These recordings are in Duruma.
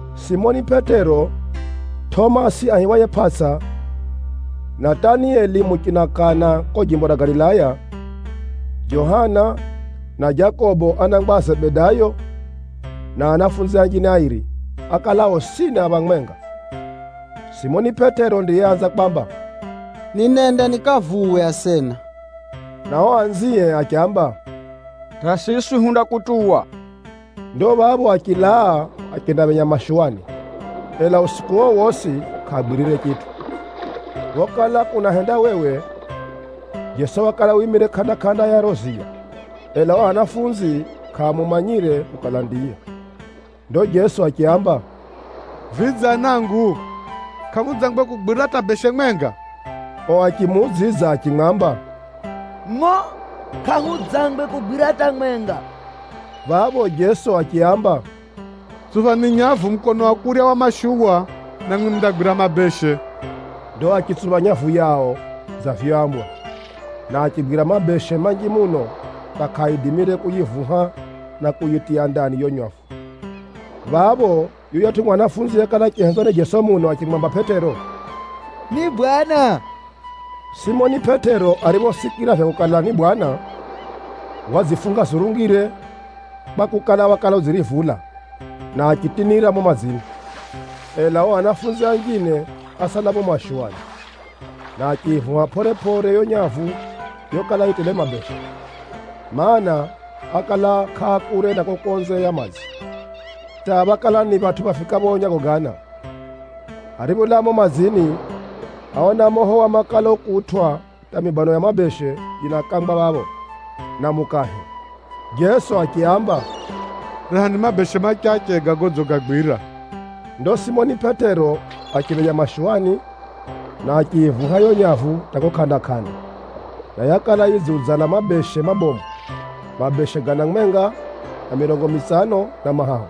Simoni Pʼetero, Tʼomasi aihiwaye Pʼatsa, Natanieli muchina Kana kuko jimbo ra Galilaya, Johana na Jakobo anangwa a Zebedayo, na anafunzi anjine airi, ákala osini a phamwenga. Simoni Pʼetero ndiyeanza kwamba, “Ninenda nikavuwe asena,” na ao anzie achiamba, “Hata siswi hundakutuwa.” Ndo phapho achilaa achendaphenya mashuwani, ela usiku uo wosi kʼaagwirire chitʼu. Phokala kunahendawewe, Jeso wakala wimire kʼanda-kʼanda ya riro ziya, ela o anafunzi kʼaamumanyire kukala ndiye. Ndo Jeso achiaamba, “Vidze anangu, kʼamudzangwe kugwira hata beshe mwenga?” Ao achimuudzidza achimwamba, “Ngʼo! Kʼahudzangwe kugwira hata mwenga.” Phapho Jeso achiaamba, “Tsuphani nyavu mukono wa kurya wa mashuwa, namwi mundagwira mabeshe.” Ndo achitsupha nyavu yao dza vyoambwa, na achigwira mabeshe manji muno hata kʼaaidimire kuyivuha na kuyitiya ndani yiyo nyavu. Phapho yuyatʼu mwanafunzi yekala achihenzwa ni Jeso muno achimwamba Pʼetero, “Ni Bwana!” Simoni Pʼetero ariphosikira vya kukala ni Bwana, wadzifunga zurungire (kwakukala, wakala udzirivula), na achitinira mumo madzini. Ela ao anafunzi anjine ásala mumo mashuwani, na achiyivuha pʼore-pʼore yo nyavu yokala yi tele mabeshe, mana, ákala kʼaakure na kuko konze ya madzi, hata phákala ni phatʼu phafikapho nyago gana. Aripholaa mumo madzini, áona moho wa makala ukutwʼa hata mibano ya mabeshe yinakangwa phapho, na mukahe. Jeso achiaamba, “Rehani mabeshe machache ga godzigagwira.” Ndo Simoni Pʼetero achiphenya mashuwani, na achiyivuha yiyo nyavu hata kuko kʼanda-kʼanda, na yakala yidziudzala mabeshe mabomu, mabeshe gana mwenga na mirongo mitsano na mahahu.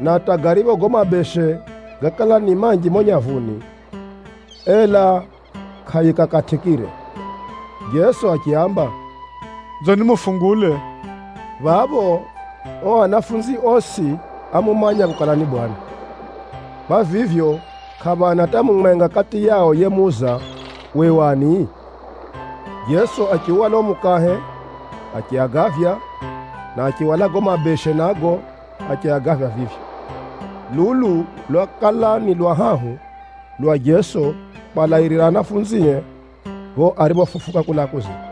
Na hata garipho gago mabeshe gákala ni manji mumo nyavuni, ela kʼayikakatʼikire. Jeso achiaamba, “Nzoni mufungule.” Phapho, ao anafunzi osi ámumanya kukala ni Bwana, na kwa vivyo, kʼaphana hata mumwenga kati yao yemuuza, “Uwe u ani?” Jeso achiuhwala uo mukahe achiagavya, na achihwala gago mabeshe nago achiagavya vivyo. Lulu lwakala ni lwa hahu lwa Jeso kwalairira anafunzie pho ariphofufuka kulaa kuzimu.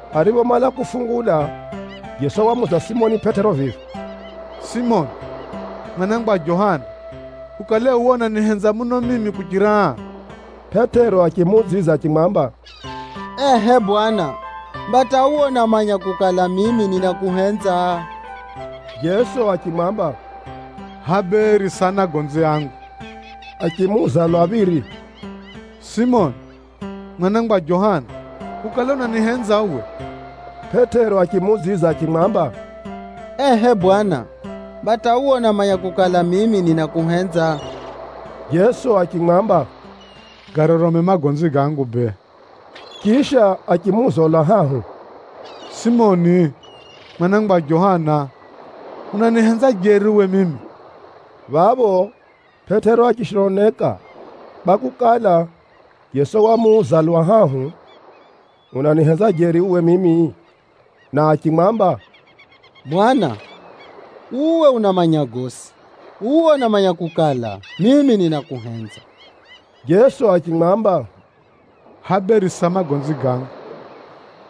Ariphomala kufungula, Jeso wamuuza Simoni Pʼetero vivi, “Simoni, mwana wa Johana! Ukale uwe unanihenza muno mimi kuchira aa?” Pʼetero achimuudzidza achimwamba, “Ehʼe Bwana, mba hata uwe unamanya kukala, mimi ninakuhenza.” Jeso achimwamba, “Hʼaya bee risa anagonzi angu.” Achimuuza lwa phiri, “Simoni, mwana wa Johana! Ukale unanihenza uwe?” Pʼetero achimuudzidza achimwamba, “Ehʼe Bwana, mba hata uwe unamanya kukala, mimi ninakuhenza.” Jeso achimwamba, “Garorome magonzi gangu bee.” Chisha achimuuza lwa hahu, “Simoni, mwana wa Johana! Unanihenza jeri uwe mimi?” Phapho Pʼetero achishononeka kwakukala, Jeso wamuuza lwa hahu: “Unanihenza jeri uwe mimi?” Na achimwamba, “Bwana, uwe unamanya gosi. Uwe unamanya kukala, mimi ninakuhenza.” Jeso achimwamba, “Hʼaya bee risa magonzi gangu.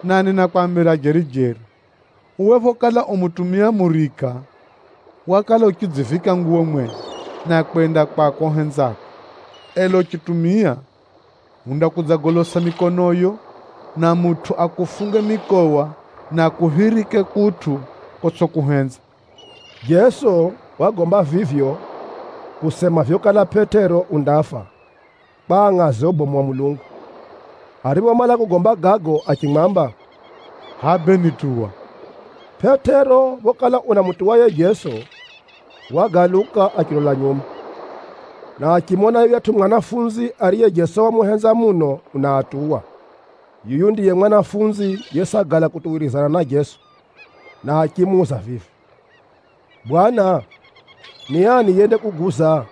Na ninakwambira jeri-jeri, uwe phokala u mutumia murika, wakala uchidzivika nguwo mwenye, na kwenda kwako uhenzako. Ela uchitumia, undakudzagolosa mikonoyo, na mutʼu akufunge mikowa na akuphirike kutʼu kotsʼikuhenza.” (Jeso wagomba vivyo, kusema vyokala Pʼetero undafa kwa angʼaze ubomu wa Mulungu.) Ariphomala kugomba gago achimwamba, “Hʼaya bee nituwa.” Pʼetero phokala unamutuwa yiye Jeso, wagaluka achilola nyuma, na achimona yuyatʼu mwanafunzi ariye Jeso wamuhenza muno unaatuwa. (Yuyu ndiye mwanafunzi yesagala kutuwirizana na Jeso, na achimuuza vivi, “Bwana, ni ani yendakuguza?”)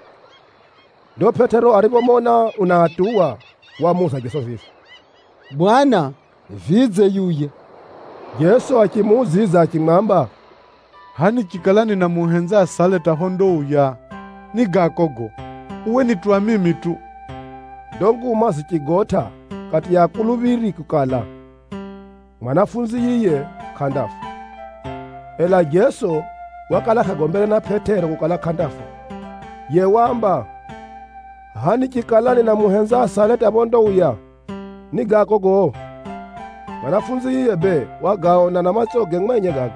Ndo Pʼetero ariphomona unaatuwa, wamuuza Jeso vivi, “Bwana, vidze, yuya?” Jeso achimuudzidza achimwamba, “Hʼaya nichikala ninamuhenza asale hata phondauya, ni gako gago? Uwe nituwa mimi tu.” Ndo nguma zichigotʼa kati ya akuluphiri kukala, mwanafunzi yiye kʼandafa. Ela Jeso wakala kʼagombere na Pʼetero kukala kʼandafa. Yiye waamba, “Hʼaya nichikala ninamuhenza asale hata phondauya, ni gako gago?” Mwanafunzi yiye bee wagaona na matsoge mwenye gago,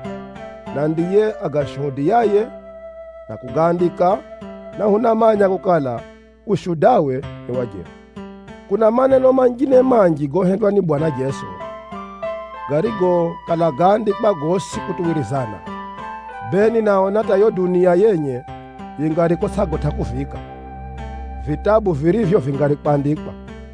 na ndiye agashuhudiyaye na kugaandika, na hunamanya kukala ushudawe ni wa jeri. Kuna maneno manjine manji gohendwa ni Bwana Jeso, garigo kala gáandikwa gosi kutuwirizana, bee ninaona hata yiyo dunia yenye yingari kutsʼagotʼa kuviika vitabu virivyo vingari kwandikwa.